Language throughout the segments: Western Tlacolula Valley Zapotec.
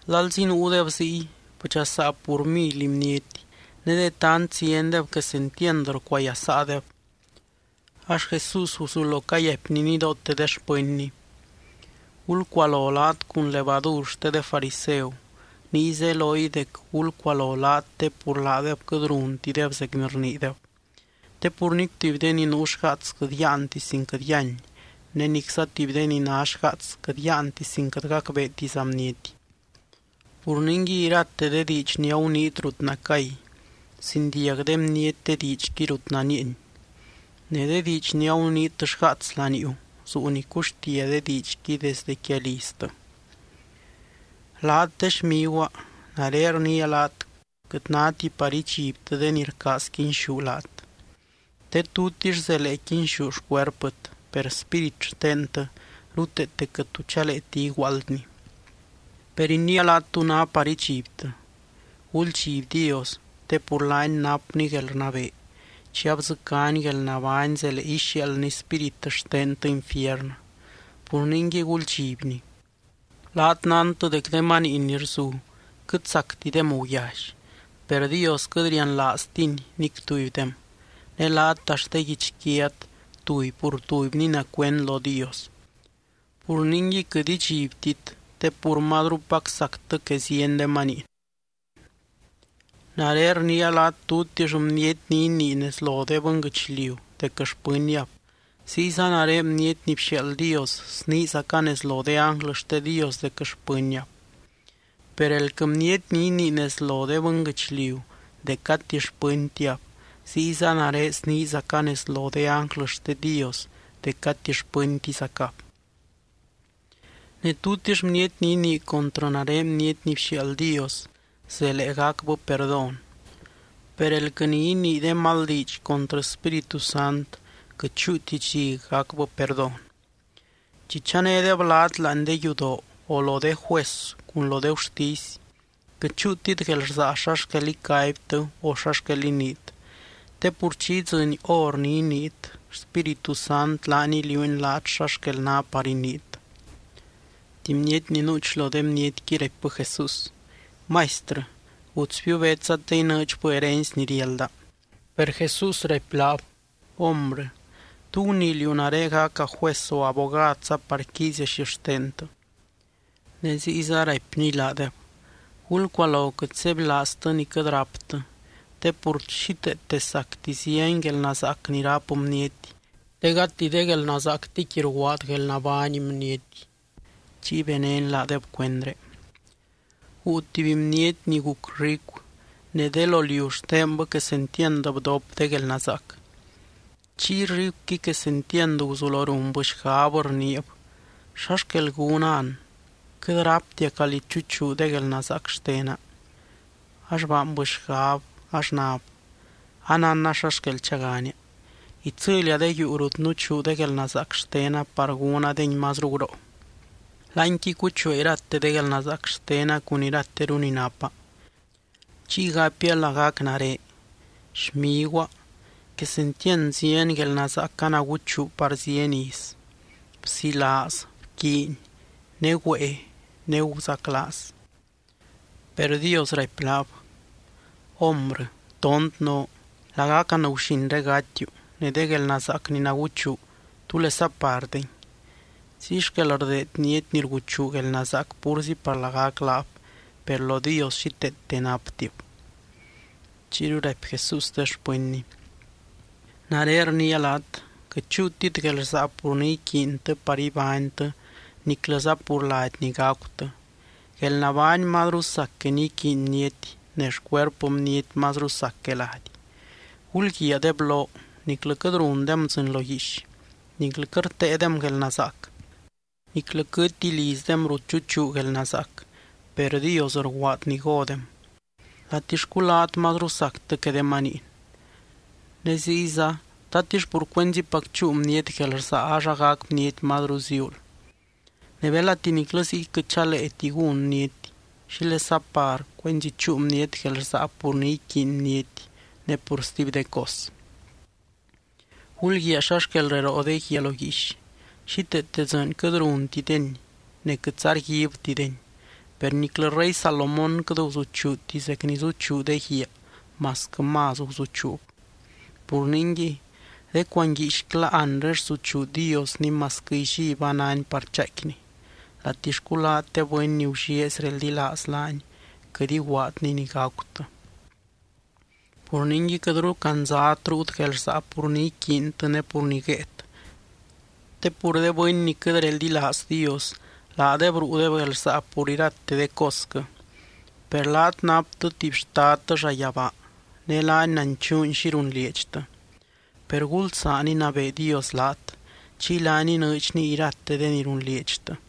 Lalzi nuudeb ziy, bdxasaa pur mily bniety, ne de tant ziendeb quesentiand rcuayasaadeb. Ax Jesús guzulo cayaipny nidoote de xpɨnny: —Gulcualo laat cun levadur xte de fariseu, niy zeloy dec gulcualo laat te pur laadeb quɨt runtideb zec ni rniideb. Te pur nic tuby de ni nuu xgaats quɨt yáanti sin quɨt yíany, ne nicza tuby de ni ná xgaats quɨt yáanti sin quɨt gacbeetiza bniety. Pur ningui irate de diidx ni aguniit rut nacay, zindiag de bniety de diidxqui rut nanieeny. Ne de diidx ni aguniit xgaats laniuu, zuu ni cuxtia de diidxqui desde quia liztɨ. ’Laat, de xmiguaa, nare rniia laat quɨt náti par idxibtɨ de ni rcaaz quinxú laat. Te tutix zelee quinxú xcuerpɨt, per spírit xtentɨ ruteete quɨt tu chaleeti iguaaldni. Per iniia laat tú ná par idxibtɨ: guldxiby Dios te pur laany napny guelrnabee, chi abdzɨcány guelnabány zelee ixiaaldny spírit xtentɨ infiernɨ. Pur ningui guldxibny. ’Laat nántɨ dec de maniin ni rzu quɨt sactidem guyally, per Dios quɨt rianlaaztiny nic tubydem. Ne laat axt de guichquiat tuby pur tubyni ná cuend lo Dios. Pur ningui quɨt idxibtit, te pur mazrupac sactɨ que zieny de maniin. ’Nare rniia laat tutix bniety ni inii nez lo de bɨnguɨchliu dec xpɨnniab, ziyza nare Bniety ni bxiaald Dios sniizaca nez lo de ánglɨ xte Dios dec xpɨnniab. Per elquɨ bniety ni inii nez lo de bɨnguɨchliu, dec gati xpɨntiab, ziyza nare sniizaca nez lo de ánglɨ xte Dios dec gati xpɨntizacab. ’Ne tutix bniety ni inii contrɨ nare Bniety ni bxiaald Dios, zelee gacbɨ perdón, per elquɨ ni inii de mal diidx contrɨ Spíritu Sant, quɨt chúuti dxi gacbɨ perdón. ’Chi chanédeb laat láani de yudoo, o lo de juez cun lo de gurtisy, quɨt chúutit guelrsaa xa xquel icaibtɨ o xa xquel iniit, te pur chi idzɨny hor ni iniit, Spíritu Sant laany iliuuny laat xa xquel ná par iniit. Tuby bniety ni nuuch lo de bnietqui raipbɨ Jesús: —Maistrɨ, gutsbiu betsa te inɨɨdxbɨ herency ni riálda. Per Jesús raipy laab: —Hombrɨ, ¿tú gunii liú nare gaca juez o abogadza par quiizia xixtentɨ? Ne ziyza raipny laadeb: —Gulcualo quɨt sebylaaztɨ ni quɨt ráptɨ, te pur xíteete sacti zieny guelnazaac ni ráp bniety, te gati de guelnazaactiqui rguaad guelnabány bniety. Chiy benény laadeb cuendré: —Guu tuby bniety ni guc ricu, ne de lo liu xtenbɨ quesentiand bdop de guelnazaac. Chiy ricuqui quesentiand guzulo runbɨ xgab rniib: “¿Xa xquel gúna an? Quɨt ráptia calí chuchuu de guelnazaac xtena.” Ax baanbɨ xgab ax nab: “Anánna xa xquel chagania. Itsɨlia de yuu rut nuchuu de guelnazaac xtena par gúnadengui mazru guroo. Láanqui cuchuaa irate de guelnazaac xtena cun irateru ni napa. Chiy gapia lagac nare: Xmiguaa, quesentiand zieny guelnazaac anaguchuu par zieny iz: bzilaaz, bquiiny, ne güée, ne guzaclaaz.” Per Dios raipy laab: “Hombrɨ, tont noo. Lagac anguxinré gatiu. Ne de guelnazaac ni naguchuu, ¿túlesa par dengui?” Ziy xquel rdeed bniety ni rguchuu guelnazaac púrzi par lagac laab, per lo Dios xíteete naptib. Chiyru raipy Jesús de xpɨnny: —Nare rniia laat: quɨt chúutit guelrsaa pur ni iquiintɨ par ibánytɨ niclɨza pur lady ni gacutɨ. Guelnabány mazru sac que ni iquiiny bniety, ne xcuerpɨ bniety mazru sac que lady. Gulguiaa de bloo. Niclɨ quɨt rundem dzɨɨny lo guiix niclɨ quɨt rteedem guelnazaac, niclɨ quɨtti lizdem rut chuchuu guelnazaac, per Dios rguaad ni godem. ¡Latixcu laat mazru sactɨ que de maniin! Ne ziyza, ¿tatix pur cuenzipac chúu bniety guelrsaa ax agac bniety mazru ziuul? Ne belati niclɨ ziy quɨt chaleeti gún bniety, ¿xílesa par cuenzi chúu bniety guelrsaa pur ni iquiiny bniety ne pur stuby de cos? ’Gulguiaa xa xquel reroo de guiaa lo guiix. Xíteete dzɨɨny quɨt runtideni ne quɨtza rguibtideni. Per niclɨ rey Salomón quɨt guzuchuuti zec ni zuchuu de guiaa masquɨ más guzuchuub. Pur ningui, de cuanguiixcla anre rsuchuu Diosni masquɨ illí ba náni par chaaicquini. Latixcu laat, de bɨny ni gullieezy reldilaaz laany, quɨt iguaadny ni gacutɨ. Pur ningui, quɨtru candzat ruut guelrsaa pur ni iquiintɨ ne pur ni guéet. Te pur de bɨny ni quɨt reldilaaz Dios, laadeb ruudeb guelrsaa pur irate de cosquɨ. Per laat naptɨ tuby Xtadtɨ llayabaa, ne laany nanchuuny xi runlieedxtɨ. Per gulsaan inabee Dios laat, chiy laany inɨɨdxny irate de ni runlieedxtɨ.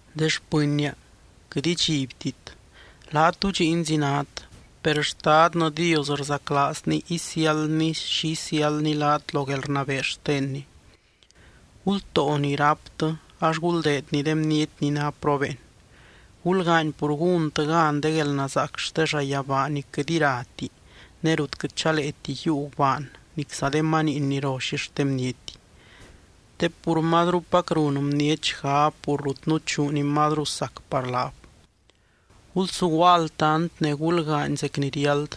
’De xpɨnnia, quɨt idxibtit. Laat dudxiinzi nát, per Xtadnɨ Dios rzaclaazny isiáldny xi isiáldny laat lo guelrnabee xtenny. Gultóo ni ráptɨ ax guldeedni de bniety ni ná probeen. Gulgaany pur gúntɨ gan de guelnazaac xte llayabaa ni quɨt irati ne rut quɨt chaleeti yiiu gubaan nicza de maniin ni ro xixten bniety. Te pur mazrupac run bniety xgab pur rut nuchuu ni mazru sac par laab. ’Gulsuguaa altant ne gulgaany zec ni riáld.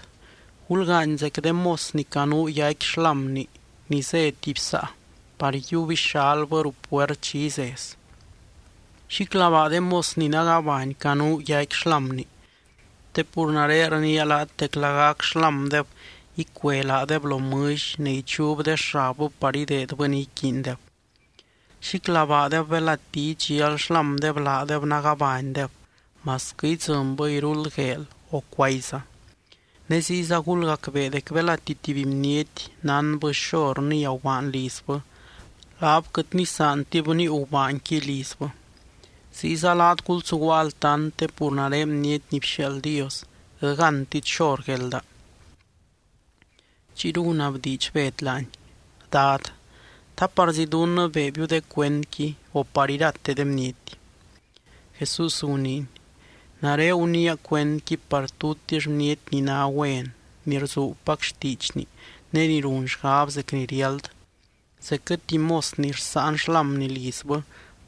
Gulgaany zec de mos ni canuu yaicqui xlámni ni zé tuby saa, par yiub ixalbɨ ruu puert chi izez. Xíclabaa de mos ni nagabany canuu yaicqui xlámni. Te pur nare rniia laat dec lagac xlámdeb icue laadeb lo mɨlly ne ichub de xabbɨ par ideedbɨ ni iquiindeb. Xíclabaadeb belati idxial xlámdeb laadeb nagabanydeb masquɨ idzɨnbɨ iruld gueel o cuayza. Ne ziyza gulgacbee dec belati tuby bniety nánbɨ xor nía gubaan lizbɨ, laab quɨt nisaantib níiu gubaanqui lizbɨ. Ziyza laat gulsuguaa altant te pur nare Bniety ni bxiaald Dios quɨt gántit xor guelda. Chiyru gunabdiidx Bed laany: —Dad, ¿ta parzí dunnɨ beebiu de cuendqui, o par irate de bniety? Jesús guniiny: —Nare guniia cuendqui par tutix bniety ni ná güen ni rzuubpac xtiidxni ne ni run xgab zec ni riáld, zecquɨ tuby mos ni rsáan xlámni lizbɨ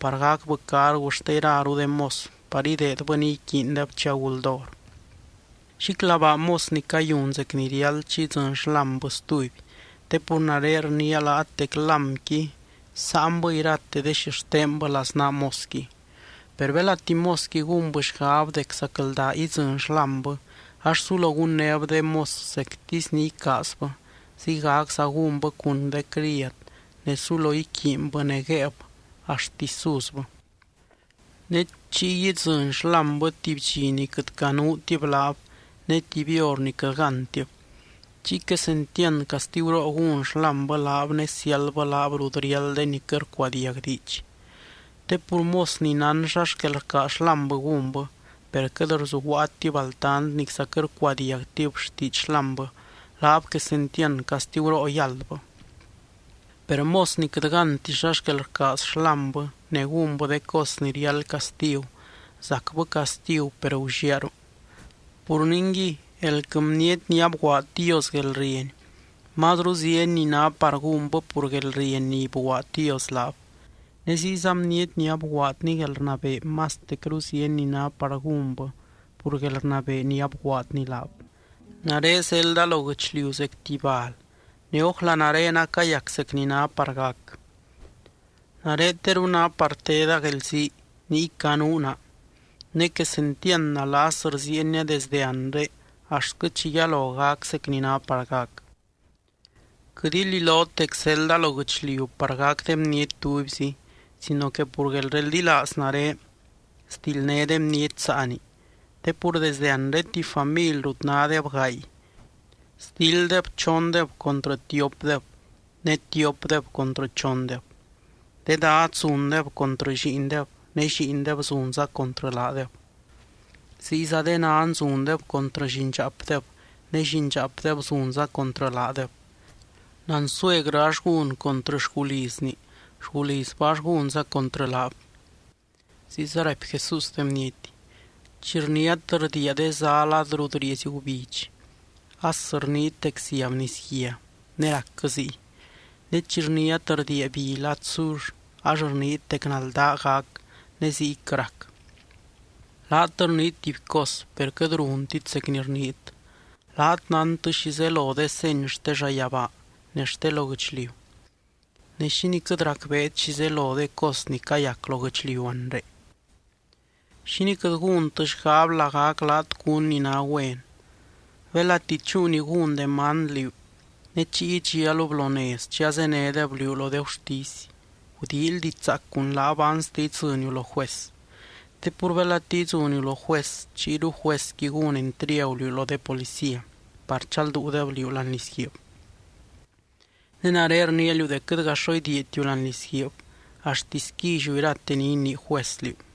par gacbɨ cargu xte iraru de mos par ideedbɨ ni iquiindeb chi aguld hor. Xíclabaa mos ni cayun zec ni riáld chi idzɨny xlámbɨ stuby te pur nare rniia laat dec lámqui sáanbɨ irate de xixtenbɨ laznaa mosqui. Per belati mosqui gúnbɨ xgab dec zacldaa idzɨny xlámbɨ ax sulo gunnéb de mos zectisy ni icaazbɨ, ziygacza gúnbɨ cun de criad ne sulo iquiinbɨ ne guéeb axtisy suzbɨ. Ne chiy idzɨny xlámbɨ tuby dxi ni quɨt canuutib laab, ne tuby hor ni quɨt gántib. Chiy quesentiand castiguroo gún xlámbɨ laab ne siáldbɨ laab rut riáld de ni quɨt rcuadiag diidx. ’Te pur mos ni nán xa xquel rcaaz xlámbɨ gúnbɨ, per quɨt rzuguaatib altant nicza quɨt rcuadiagtib xtiidx xlámbɨ, laab quesentiand castiguroo yáldbɨ. Per mos ni quɨt gánti xa xquel rcaaz xlámbɨ ne gúnbɨ de cos ni riáld castigu, zacbɨ castigu per gulliaaru. Pur ningui, elquɨ bniety ni abguaad Dios guelrieny, mazru zieny ni ná par gúnbɨ pur guelrieny ni bguaad Dios laab. Ne ziyza bniety ni abguaadny guelrnabee mastecru zieny ni ná par gúnbɨ pur guelrnabee ni abguaadny laab. ’Nare zelda lo guɨchliu zec tuby bal ne, ¡ójla nare acayac zec ni ná par gac! Nare teru ná par teda guelzii niy canuu naa ne, ¡quesentiand nalas rziienia desdɨ anre axtquɨ chi yalo gac zec ni ná par gac! Quɨt ililot dec zelda lo guɨchliu par gac de bniety tubyzi sino que pur guelreldilaaz nare sdildné de bniety saani. Te pur desde anre tuby family rut nádeb gaay, sdilddeb chondeb contrɨ tiopdeb, ne tiopdeb contrɨ chondeb. De dad zundeb contrɨ lliindeb ne lliindeb zunza contrɨ laadeb. Ziyza de nan zundeb contrɨ llindxaapdeb ne llindxaapdeb zunza contrɨ laadeb. Nansuegrɨ ax gún contrɨ xgulizni, xgulizbɨ ax gúnza contrɨ laab. Ziyza raipy Jesús de bniety: —Chi rniát rdiia de zá lad rut rieezy gubidx as rniit dec ziab nisguia ne racquɨ ziy. Ne chi rniát rdiia bi lad sur ax rniit dec naldaa gac ne ziyquɨ rac. ¡Laat rniit tuby cos per quɨt runtit zec ni rniit! Laat nántɨ xi zelo de seny xte llayabaa ne xte lo guɨchliu, ne, ¿xínii quɨt racbeet xi zelo de cos ni cayac lo guɨchliu anre? ’¿Xínii quɨt gúntɨ xgab lagac laat cún ni ná güen? Belati chúu ni gún demand liú ne chiy idxialub lo nez chi azénedeb liú lo de gurtisy, gudíily diidx zaac cun laab anste idzɨniu lo juez. Te pur belati idzɨniu lo juez, chiyru juezqui gún entriagu liú lo de policía par chalduudeb liú láani lizguiib. Ne nare rniia liú dec quɨtga xo idiiatiu láani lizguiib axtisy quilliu irate ni inii juez liú.